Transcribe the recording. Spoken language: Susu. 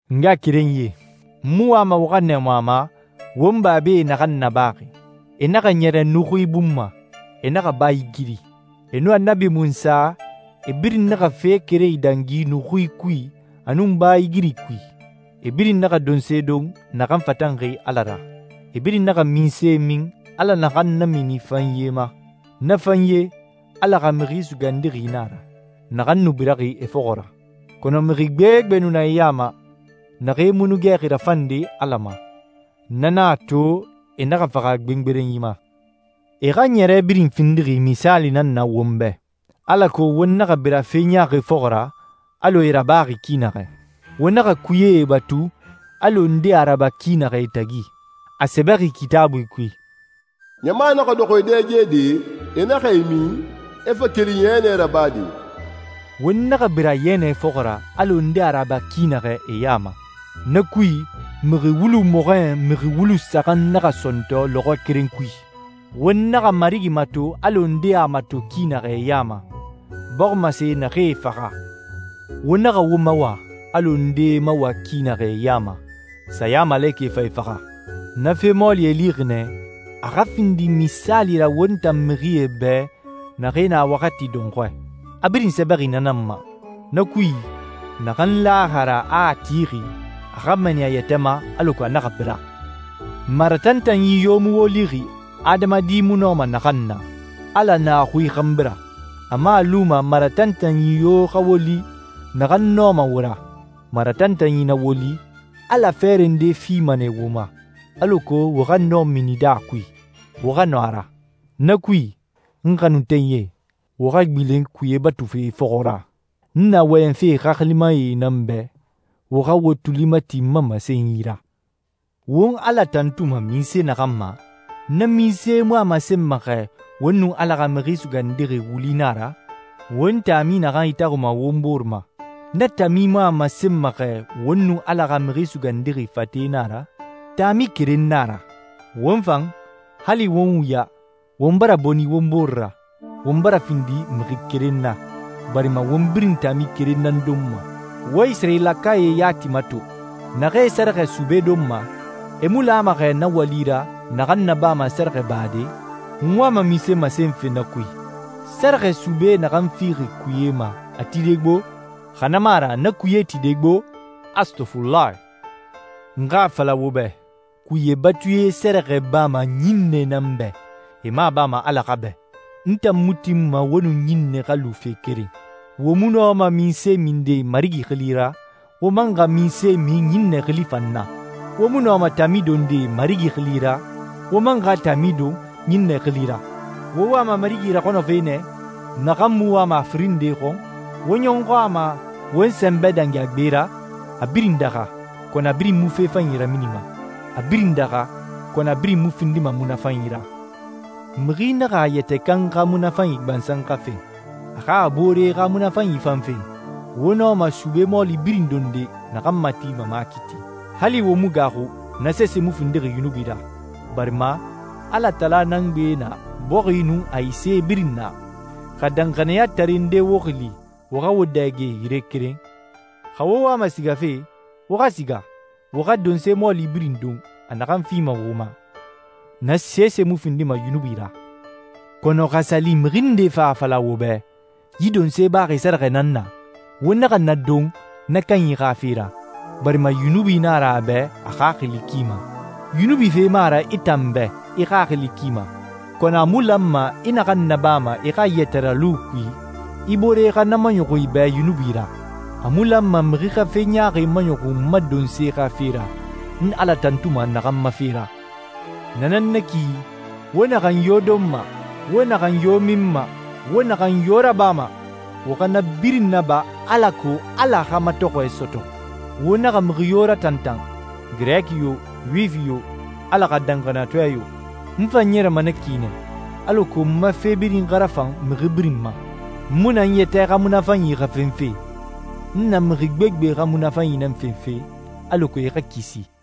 N ngaxakerenyie, n mu wama wo xa nɛɛmu a ma won babae naxan nabaxi. E naxa ɲɛrɛ nuxui bun ma, e naxa baa igiri. E nun Annabi Munsa, e birin naxa fe keren idangi nuxui kui a nun baa igiri kui. E birin naxa donse don naxan fatanxi Ala ra. E birin naxa minse min, Ala naxan namini fanye ma. Na fanye, Ala xa Mixi Sugandixi nan a ra, naxan nu biraxi e fɔxɔ ra. Kɔnɔ mixi gbegbe nu na e ya ma, naxee mu nu gɛxi rafande Ala ma, na nan a to e naxa faxa gbengberenyi ma. E xa ɲɛrɛ birin findixi misaali nan na won bɛ, alako won naxa bira fe ɲaaxi fɔxɔ ra alɔ e a rabaxi ki naxɛ. Wo naxa kuyee batu, alɔ ndee a raba ki naxɛ e tagi. A sɛbɛxi Kitaabui kui, «Ɲama naxa dɔxɔ e dɛgede, e naxa e min, e fa keli yɛnɛ rabade.» Won naxa bira yɛnɛ fɔxɔ ra alɔ ndee a raba ki naxɛ e ya ma. Na kui, mixi wulu mɔxɔɲɛn mixi wulu saxan naxa sɔntɔ lɔxɔɛ keren kui. Won naxa Marigi mato alɔ ndee a mato ki naxɛ e ya ma, bɔximasee naxee faxa. Wo naxa wo mawa, alɔ ndee e mawa ki naxɛ e ya ma, sayamalekɛ fa e faxa. Na fe mɔɔli e lixi nɛ, a xa findi misaali ra won tan mixie bɛ naxee na waxati dɔnxɔɛ. A birin sɛbɛxi na nan ma. Na kui, naxan laxi a ra a tixi, a xa mɛɛni a yɛtɛ ma alako a naxa bira. Maratantanyi yo mu wo lixi, adamadi mu nɔma naxan na. Ala na a xui xanbi ra. A mu a luma maratantanyi yo xa wo li, naxan nɔma wo ra. Maratantanyi na wo li, Ala fɛɛrɛ nde fima nɛ wo ma, alako wo xa nɔ minide a kui, wo xa nɔ a ra. Na kui, n xanuntenyie, wo xa gbilen kuye batufe fɔxɔ ra. N na wɔyɛnfe xaxilimae nan bɛ, wo xa wo tuli mati n ma masenyi ra. Won Ala tantuma minse naxan ma, na minse mu a masenma xɛ won nun Ala xa Mixi Sugandixi wuli na a ra? Won taami naxan itaxunma won bore ma, na taami mu a masenma xɛ won nun Ala xa Mixi Sugandixi fate na a ra? Taami keren nan a ra. Won fan, hali won wuya, won bara boni won bore ra, won bara findi mixi keren na, barima won birin taami keren nan donma. Wo Isirayilakae yati mato. Naxee sɛrɛxɛ sube donma, e mu lama xɛ na wali ra naxan nabama sɛrɛxɛbade? N wama munse masenfe na kui? Sɛrɛxɛ sube naxan fixi kuye ma a tide gbo? Xa na mu a ra na kuye tide gbo? Astɔfulahi. N xa a fala wo bɛ, kuye batuie sɛrɛxɛ bama ɲinnɛe nan bɛ, e mu a bama Ala xa bɛ. N tan mu tinma wo nun ɲinnɛe xa lu fe keren. Wo mu nɔma minse minde Marigi xili ra, wo man xa minse min ɲinnɛe xili fan na. Wo mu nɔma taami donde Marigi xili ra, wo man xa taami don ɲinnɛe xili ra. Wo wama Marigi raxɔnɔfe nɛ, naxan mu wama a firin nde xɔn? Wo ɲɔxɔ a ma won sɛnbɛ dangi a gbe ra? A birin daxa, kɔnɔ a birin mu fe fanyi raminima. A birin daxa, kɔnɔ a birin mu findima munafanyi ra. Mixi naxa a yɛtɛ kan xa munafanyi gbansan xa fen, a xa a boore xa munafanyi fan fen. Wo nɔma sube mɔɔli birin donde naxan matima makiiti. Hali wo mu gaaxu, na sese mu findixi yunubi ra, barima «Alatala nan gbe na bɔxi nun a ise birin na.» Xa danxaniyatare nde wo xili wo xa wo dɛge yire keren, xa wo wama sigafe, wo xa siga, wo xa donse mɔɔli birin don a naxan fima wo ma. Na sese mu findima yunubi ra. Kɔnɔ xa a sa li mixi nde fa a fala wo bɛ, «Yi donse baxi sɛrɛxɛ nan na,» wo naxa na don na kanyi xa fe ra, barima yunubi nan a ra a bɛ a xaxili ki ma. Yunubi fe mu a ra i tan bɛ i xaxili ki ma, kɔnɔ a mu lanma i naxan nabama i xa yɛtɛralu kui, i boore xa na maɲɔxun i bɛ yunubi ra. A mu lanma mixi xa fe ɲaaxi maɲɔxun n ma donse xa fe ra, n Ala tantuma naxan ma fe ra. Na nan na ki, wo naxan yo donma, wo naxan yo minma, wo naxan yo rabama, wo xa na birin naba alako Ala xa matɔxɔɛ sɔtɔ. Wo naxa mixi yo ratantan, Girɛki yo, Yuwifi yo, Ala xa danxaniyatɔɛ yo. N fan ɲɛrɛma na ki nɛ, alako n ma fe birin xa rafan mixi birin ma. N mu na n yɛtɛ xa munafanyi xa fenfe. N na mixi gbegbe xa munafanyi nan fenfe, alako e xa kisi.